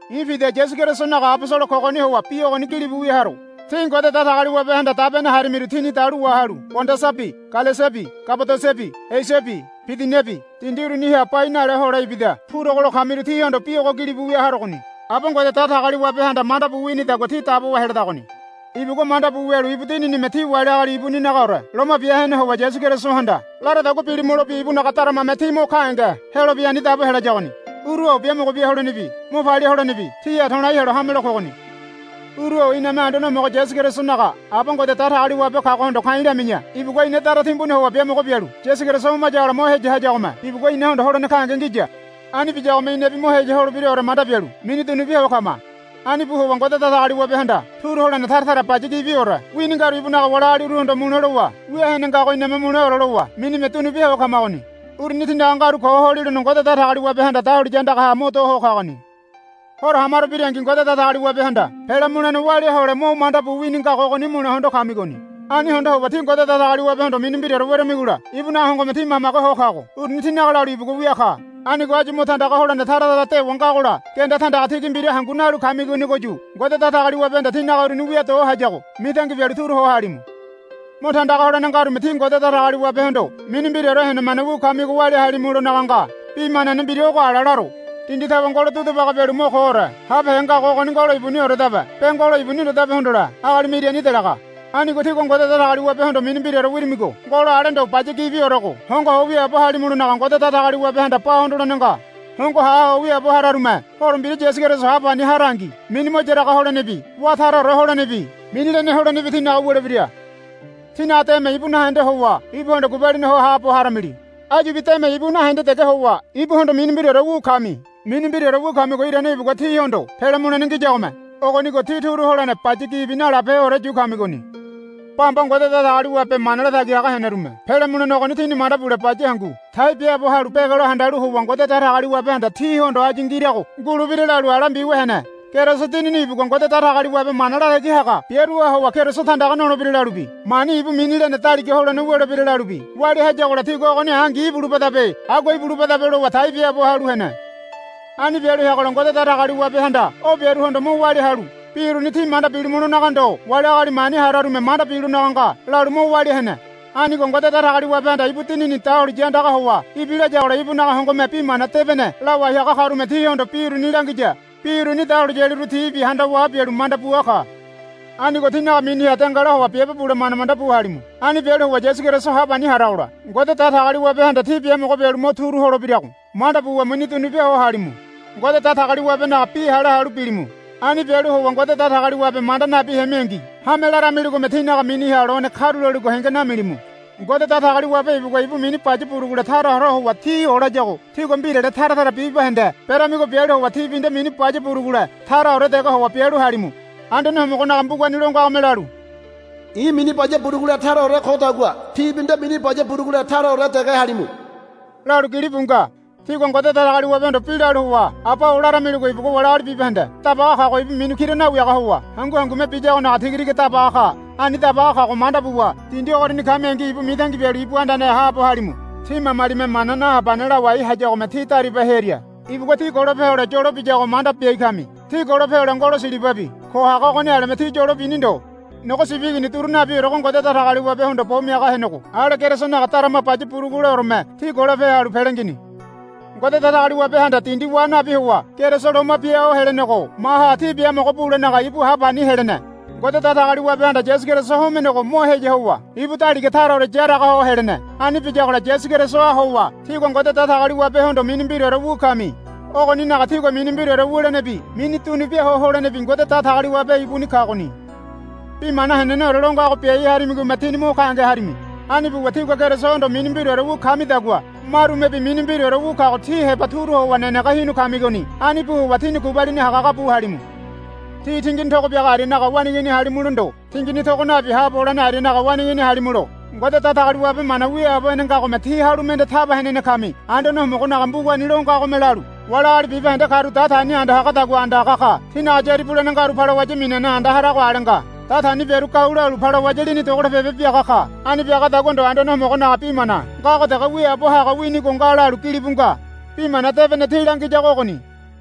I̱ Pida Yasu Kerisonaga abosolo kogoni howa bi ogoni gilibu wia haro. Tí Ngode Datagaliwabehanda dabene harimiru tíni dalu wahalu Pondasabi Galesiabi Kabadosiabi Esiabi Bidiniabi dindi uruniha bai naleha hole ibida purogo lo kamiru tíhondo bi ogo gilibu wia harogoni. Aba Ngode Datagaliwabehanda manda bu winidagua tí dabowa heledagoni. Ibugua manda bu wialu ibu Dininime tí wali agali ibuninagaore loma bia hene howa Yasu Kerisohanda laradagua bilimulobi ibunaga daramame tí mo gahenge helobi ani dabo helayagoni. Uru-o biamogo bia holenebi mo palia holenebi tíha to̱lai helo hame lo kogoni. Uru-o iname Anduane Homogo Yasu Kerisonaga Aba Ngode Datagaliwabe kagohondo ka̱i̱ lami̱ya. Ibugua ina dara timbuni howa biamogo bialu Yasu Keriso homayagola mo heya hayagome ibugua inahondo holene gahenge ngiya. Ani biyagome inabi mo heya holebiraore manda bialu mini dunu bia ho kama. Ani bu howa Ngode Datagaliwabehanda turu holene tara tara baya gibiore wini ngaru ibunaga wali agaliruhondo mule lowa wia hene ngago iname muleore lowa minime dunu bia ho kamagoni. Uruni tínaga ngaru ko holilono Ngode Datagaliwabehanda dahuliya andagaha mo do ho kagoni. Horo ha maro birangi Ngode Datagaliwabehanda pele mulene walia hole mo manda bu wini ngago ogoni mule hondo kamigoni. Ani hondo howa tí Ngode Datagaliwabehondo mini mbiraore weramigola ibunaga hongome tí mamage ho kago uruni tínaga lalu ibugua wia ka. Anigo áyu mo tandaga holene tara tara dewa ngagola genda tandaga tigi mbira hangunaga nalu kamigonigoyu Ngode Datagaliwabehanda tínaga uruni wia do hayago mitangi bialu turu ho halimu. Mo tandaga holene ngarume tí Ngode Datagaliwabehondo mini mbiraore henemane wu kamigo walia halimulonaga nga. Bi manane mbira ogo ala laro. Dindi tawe ngolo dudu baga bialu mo koore habehe ngago ogoni ngolo ibunioredabe be ngolo ibuni ndodabe hondole agalime irani delaga. Anigo tígua Ngode Datagaliwabehondo mini mbiraore wirimigo ngolo ale ndo baya gibiorego hongo ho wiaabo halimulonaga Ngode Datagaliwabehanda ba hondolene nga. Hongo ha ho wiaabo hararume Horo Mbira Yasu Keriso ha pani harangi mini mo yaraga holenebi wá taraore holenebi mini lene holenebi tínaga wulebira. Tínaga deme ibu nahende howa ibuhondo gubalini ho haabo haramili. Áyubi deme ibu nahende dege howa ibuhondo mini mbiraore wu kami. Mini mbiraore wu kamigo irane ibugua tíhondo pele mulene ngiyagome. Ogonigo tí turu holene baya gibi nalabeheore yu kamigoni. Bamba Ngode Datagaliwabe mana latagi haga henerume pele mulene ogoni tini manda bule baya hangu tai biaabo halu begelo handalu howa Ngode Datagaliwabehanda tíhondo áyu ngirago ngulebira lalu ala mbiwia hene. Keriso Dinini ibugua Ngode Datagaliwabe mana latagi haga biaruha howa Keriso tandaga nolebira lalubi mani ibu mini lene daliga holene wulebira lalubi walia hayagola tigua ogoni angi ibulubadabe agua ibulubadabe lowa tai biaabo halu hene. Ani bialu heagola Ngode Datagaliwabehanda o biaruhondo mo walia halu, Bi uruni tí manda bilimulonaga ndo wali agali mani hararume manda bilonaga nga, lalu mo walia hene. Anigo Ngode Datagaliwabehanda ibu Dinini dahuliya andaga howa ibilayagola ibunaga hongome Bi Mana Debene lawai haga karume tíhondo bi uruni langiya. Bi uruni dahuliyaliru tibi handawa bialu manda bua ka. Anigo tínaga miniha dengala howa biabe bule manda manda bu halimu. Ani bialu howa Yasu Keriso ha pani haragola Ngode Datagaliwabehanda tí biamogo bialu mo turu holebirago manda buwa mini dunubia ho halimu. Ngode Datagaliwabenaga bi hale halu bilimu. Ani bialu howa Ngode Datagaliwabe manda nabi hemingi hame laramiligome tínaga miniha lone karuloligo henge namilimu. Ngode Datagaliwabe ibugua ibu mini baya burugule taraore howa tí olayago tígua mbirale tara tara bibahende beramigo bialu howa tíbi nde mini baya burugule taraore dege howa bialu halimu. Anduane Homogonaga mbugani lo ngagome lalu, I̱ mini baya burugule taraore kodagua tíbi nde mini baya burugule taraore dege halimu, lalu gilibu nga. Tígua Ngode Datagaliwabehondo bi lalu howa, Aba-o, laramiligo ibugua wali agali bibahende dabaga kago ibu mini kira nawiaga howa hangu hangume biyagonaga tigatiga dabaga ka. Ani dabaga kago manda buwa dindi ogoriani kamingi ibu mitangi bialu ibu andaneha haabo halimu. Tí mamalime mana nahabane lawai hayagome tí dariba hearia ibugua tí golope hole yolo biyago manda biai kami. Tí golope hole ngolo silibabi ko haga ogoni aleme tí yolo bini ndo. Nogo sibi igini duru nabiorego Ngode Datagaliwabehondo bo miaga henego ale Kerisonaga darama baya buruguleoreme tí golope halu pele ngini. Ngode Datagaliwabehanda dindi wa nabi howa Keriso loma bia ho helenego maha tí biamogo bulenaga ibu ha pani helene. Ngode Datagaliwabehanda Yasu Keriso homenego mo heya howa ibu daliga taraore yaraga ho helene. Ani biyagola Yasu Kerisoha howa tígua Ngode Datagaliwabehondo mini mbiraore wu kami. Ogoninaga tígua mini mbiraore wulenebi mini dunubia ho holenebi Ngode Datagaliwabe ibuni kagoni. Bi mana heneneore lo ngago biai harimigome tíni mo gahenge harimi. Ani buwa tígua Kerisohondo mini mbiraore wu kamidagua marumebi mini mbiraore wu kago ti heba turu howa nenege hinu kamigoni. Ani bu howa tíni gubalini hagahaga bu halimu. Tí tingini togo biaga arianaga waneigini halimulo ndo tingini togo nabi haabo holene arianaga waneigini halimulo Ngode Datagaliwabe mana wiaabo hene ngagome tí halu mende taba henene kami. Anduane Homogonaga mbugani lo ngagome lalu, Wali agali bibahende karu datani anda hagadagua anda haga ka. Tinaga yári bulene ngaru balawaya minane anda harago ale nga. Datani biaru gau lalu balawaya lini dogolopebe biaga ka. Ani biagadagua ndo Anduane Homogonaga bi mana ngago dege wiaabo haga winigo nga, lalu gilibu nga. Bi Mana Debene tí langiyago ogoni.